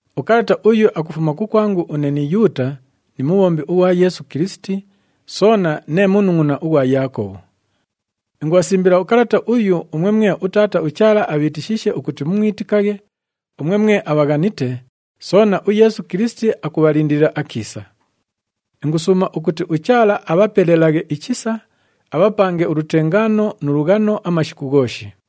Ukalata uyu akufuma kukwangu une ni Yuuta ni mubhombi ughwa Yeesu Kilisiti, soona nee munungʼuna ughwa Yaakobhu. Ingubhasimbila ukalata uyu umwe mwe uTaata uChaala abhiitishiishe ukuti mumwitikaghe, umwe mwe abhaghanite, soona uYeesu Kilisiti akubhalindilila akiisa. Ingusuuma ukuti uChaala abhapelelaghe ichisa, abhapange ulutengaano nu lughano amashiku ghooshi.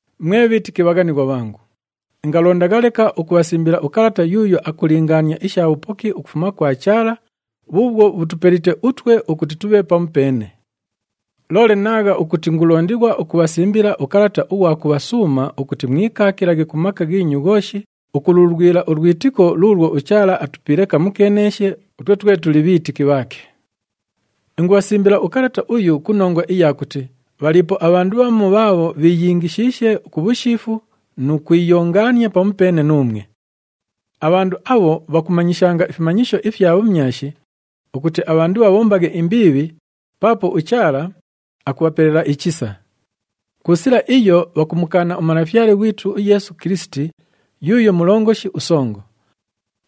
Mwe bhiitiki abhaghanighwa bhangu, ingalondagha leka ukubhasimbila ukalata yuuyo akulingaania isha bhupoki ukufuma kwa Chaala bhuubhwo bhutupelite utwe ukuti tubhe pamupeene. Loole naagha ukuti ingulondighwa ukubhasimbila ukalata ughwa kubhasuuma ukuti mwikaakilaghe ku maka ghiinyu ghooshi ukululwila ulwitiko luulwo uChaala atupiile kamukeeneeshe utwe twe tuli bhiitiki bhaake. Ingubhasimbila ukalata uyu ku nongwa iya kuti bhaliipo abhandu bhamu bhaabho bhiiyingishiishe ku bhushiifu nu kwiyongaania pamupeene nuumwe. Abhandu abho bhakumanyishanga ifimanyisho ifya bhumyashi ukuti abhandu bhabhombaghe imbiibhi paapo uChaala akubhapelela ichisa. Ku sila iyo, bhakumukaana uMalafyale ghwitu uYeesu Kilisiti yuuyo Mulongoshi uSongo.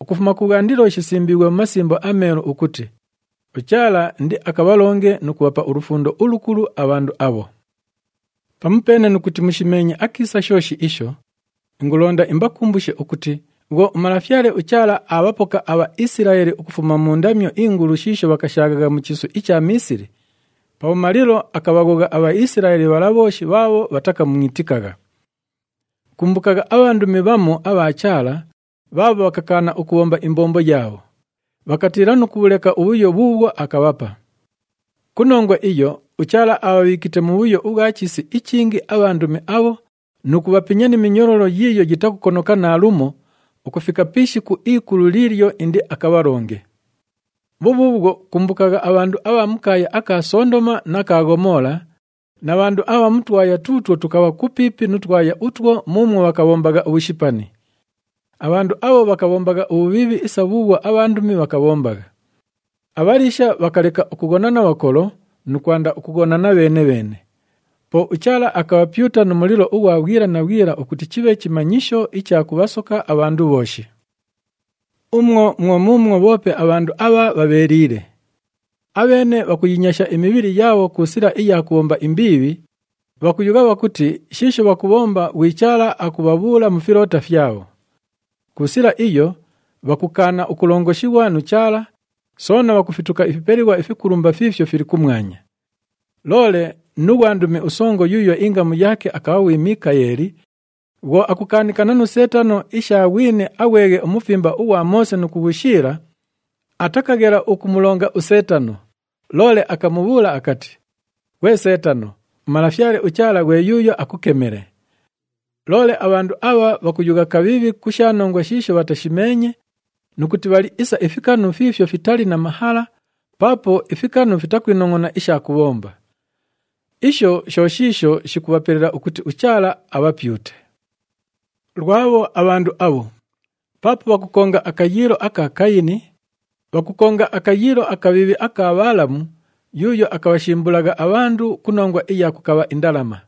Ukufuma kubhwandilo shisimbiighwe mu Masimbo aMeelu ukuti uChaala indiakabhalonge nu kubhapa ulufundo ulukulu abhandu abho. Pamupeene nu kuti mushimeenye akiisa shooshi isho, ingulonda imbakumbushe ukuti bhwo uMalafyale uChaala aabhapoka aBhaisilaeli ukufuma mu ndamyo ingulu shiisho bhakashaaghagha mu chiisu icha Miisili, pabhumalilo akabhaghogha aBhaisilaeli bhala bhooshi bhaabho bhatakamwitikagha. Kumbukagha abhandumi bhamu abha Chaala bhaabho bhakakaana ukubhomba imbombo yaabho, bhakatiila nu kubhuleka ubhuyo bhuubhwo akabhapa. Ku nongwa iyo, uChaala abhabhiikite mubhuyo ubhwa chiisi ichingi abhandumi abho nu kubhapinya ni minyololo yiiyo yitakukonoka naalumo ukufika pi ishiku ikulu liilyo indiakabhalonge. Bhubhuubhwo, kumbukagha abhandu abha mu kaaya aka Sondoma na ka Ghomoola na bhandu abha mu twaya tuutwo tukabha kupiipi nu twaya utwo muumwo bhakabhombagha ubhushipani. Abhandu abho bhakabhombagha ubhubhiibhi isa bhuubhwo abhandumi bhakabhombagha. Abhaliisha bhakaleka ukughona na bhakolo nu kwanda ukughonana bheene-bheene. Po uChaala akabhapyuta nu mulilo ughwa bhwila na bhwila ukuti chibhe chimanyisho icha kubhasoka abhandu bhooshi. Umwo mwo muumwo bhoope abhandu abha bhabheeliile. Abheene bhakuyinyasha imibhili yaabho ku sila iya kubhomba imbiibhi, bhakuyugha bhakuti shiisho bhakubhomba ghwi Chaala akubhabhuula mu filoota fyabho. Ku sila iyo, bhakukaana ukulongoshighwa nu Chaala, soona bhakufituka ifipelighwa ifikulumba fiifyo fili kumwanya. Loole nu ghwandumi usongo yuuyo ingamu yaake akabha ghwi Mikaeli, bhwo akukaanikana nu Seetano isha ghwini aghweghe umufimba ughwa Moose nu kughushiila, atakaghela ukumulonga uSeetano, loole akamubhuula akati, “Ghwe Seetano, uMalafyale uChaala ghwe yuuyo akukemele.” Loole abhandu abha bhakuyugha kabhiibhi ku sha nongwa shiisho bhatashimeenye nu kuti bhali isa ifikanu fiifyo fitali na mahala paapo ifikanu fitakwinongʼona isha kubhomba. Isho sho shiisho shikubhapelela ukuti uChaala abhapyute. Lwabho abhandu abho! Paapo bhakukonga akayiilo aka Kayini, bhakukonga akayiilo akabhiibhi aka Bhaalamu yuuyo akabhashimbulagha abhandu ku nongwa iya kukabha indalama.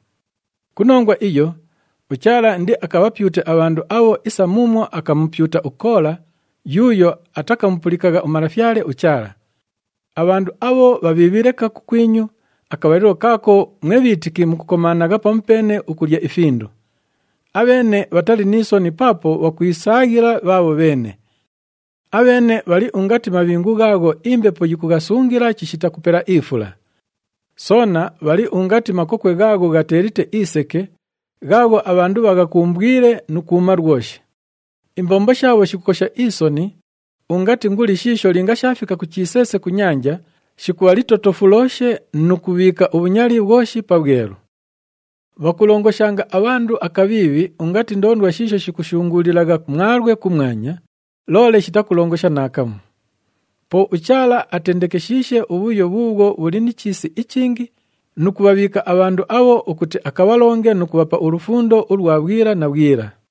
Ku nongwa iyo, uChaala indiakabhapyute abhandu abho isa muumwo akamupyuta uKoola yuuyo atakamupulikagha uMalafyale uChaala. Abhandu abho bhabhiibhi leka kukwinyu akabhalilo kaako mwe bhiitiki mukukomaanagha pamupeene ukulya ifindu. Abheene bhatali ni soni paapo bhakwisaaghila bhaabho bheene. Abheene bhali ungati mabhingu ghaagho imbepo yikughasungila chishita kupela ifula. Soona bhali ungati makokwe ghaagho ghateelite iseke, ghaagho abhandu bhaghakumbwile nu kwuma lwoshi. Imbombo shaabho shikukosha isoni ungati nguli shiisho linga shaafika ku chiseese ku nyanja, shikubha litotofulooshe nu kubhiika ubhunyali bhwoshi pabhwelu. Bhakulongoshanga abhandu akabhiibhi ungati ndoondwa shiisho shikushunguulilagha mwalwe kumwanya, loole shitakulongosha naakamu. Po uChaala atendekeshiishe ubhuyo bhuubhwo bhuli ni chiisi ichingi nu kubhabhiika abhandu abho ukuti akabhalonge nu kubhapa ulufundo ulwa bhwila na bhwila.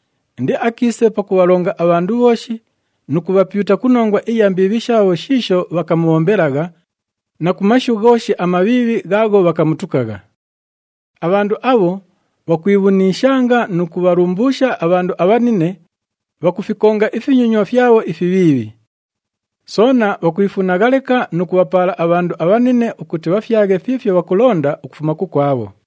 Indiakiise pakubhalonga abhandu bhooshi nu kubhapyuta ku nongwa iya mbiibhi shaabho shiisho bhakamubhombelagha na ku mashu ghooshi amabhiibhi ghaagho bhakamutukagha.” Abhandu abho bhakwibhuniishanga nu kubhalumbuusha abhandu abhanine, bhakufikonga ifinyonywa fyabho ifibhiibhi. Soona bhakwifunagha leka nu kubhapaala abhandu abhanine ukuti bhafyaghe fiifyo bhakulonda ukufuma kukwabho.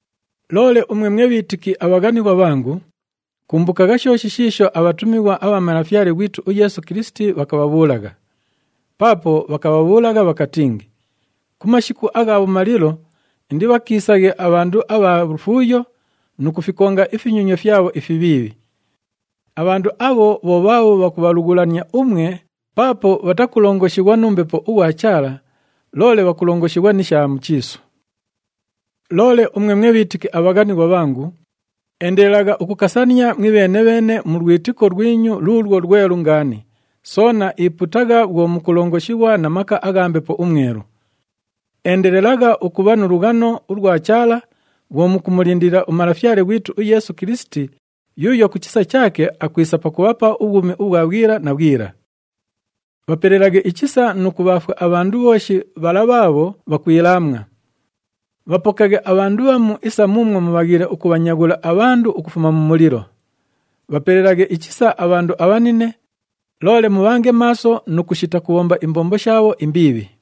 Loole umwe mwe bhiitiki abhaghanighwa bhangu, kumbukagha shooshi shiisho abhatumighwa abha Malafyale ghwitu uYeesu Kilisiti bhakabhabhuulagha. Paapo bhakabhabhuulagha bhakatingi, “Ku mashiku agha bhumalilo indibhakiisaghe abhandu abha lufuuyo nu kufikonga ifinyonywa fyabho ifibhiibhi.” Abhandu abho bho bhaabho bhakubhalughulania umwe paapo bhatakulongoshighwa nu Mbepo ughwa Chaala, loole bhakulongoshighwa ni sha mu chiisu. Loole umwe mwe bhiitiki abhaghanighwa bhangu, endelelagha ukukasania mwibheene-bheene mu lwitiko lwinyu luulwo lwelu ngaani, soona ipuutagha bhwo mukulongoshighwa na maka agha Mbepo uMwelu. Endelelagha ukubha mu lughano ulwa Chaala bhwo mukumulindilila uMalafyale ghwitu uYeesu Kilisiti yuuyo ku chisa chaake akwisa pakubhapa ubhwumi ubhwa bhwila na bhwila. Bhapelelaghe ichisa nu kubhaafwa abhandu bhooshi bhala bhaabho bhakwilaamwa. Bhapokaghe abhandu bhamu isa muumwo mubhaghiile ukubhanyaghula abhandu ukufuma mu mulilo. Bhapelelaghe ichisa abhandu abhanine, loole mubhange maaso nu kushita kubhomba imbombo shaabho imbiibhi.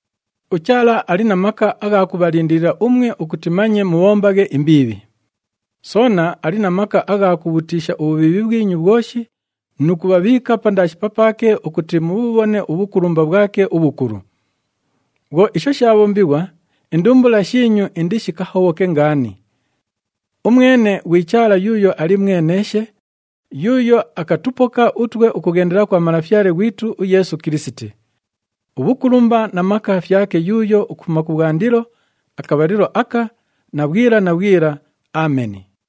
UChaala ali na maka agha kubhalindilila umwe ukuti manye mubhombaghe imbiibhi. Soona ali na maka agha kubhutiisha ubhubhiibhi bhwinyu bhwoshi nu kubhabhiika pandaashi papaake ukuti mubhubhone ubhukulumba bhwake ubhukulu. Bhwo isho shaabhombighwa, indumbula shiinyu indishikahobhoke ngaani. Umwene ghwi Chaala yuuyo ali mweneeshe, yuuyo akatupoka utwe ukughendela kwa Malafyale ghwitu uYeesu Kilisiti. Ubhukulumba na maka fyake yuuyo ukufuma kubhwandilo, akabhalilo aka na bhwila na bhwila. Ameni.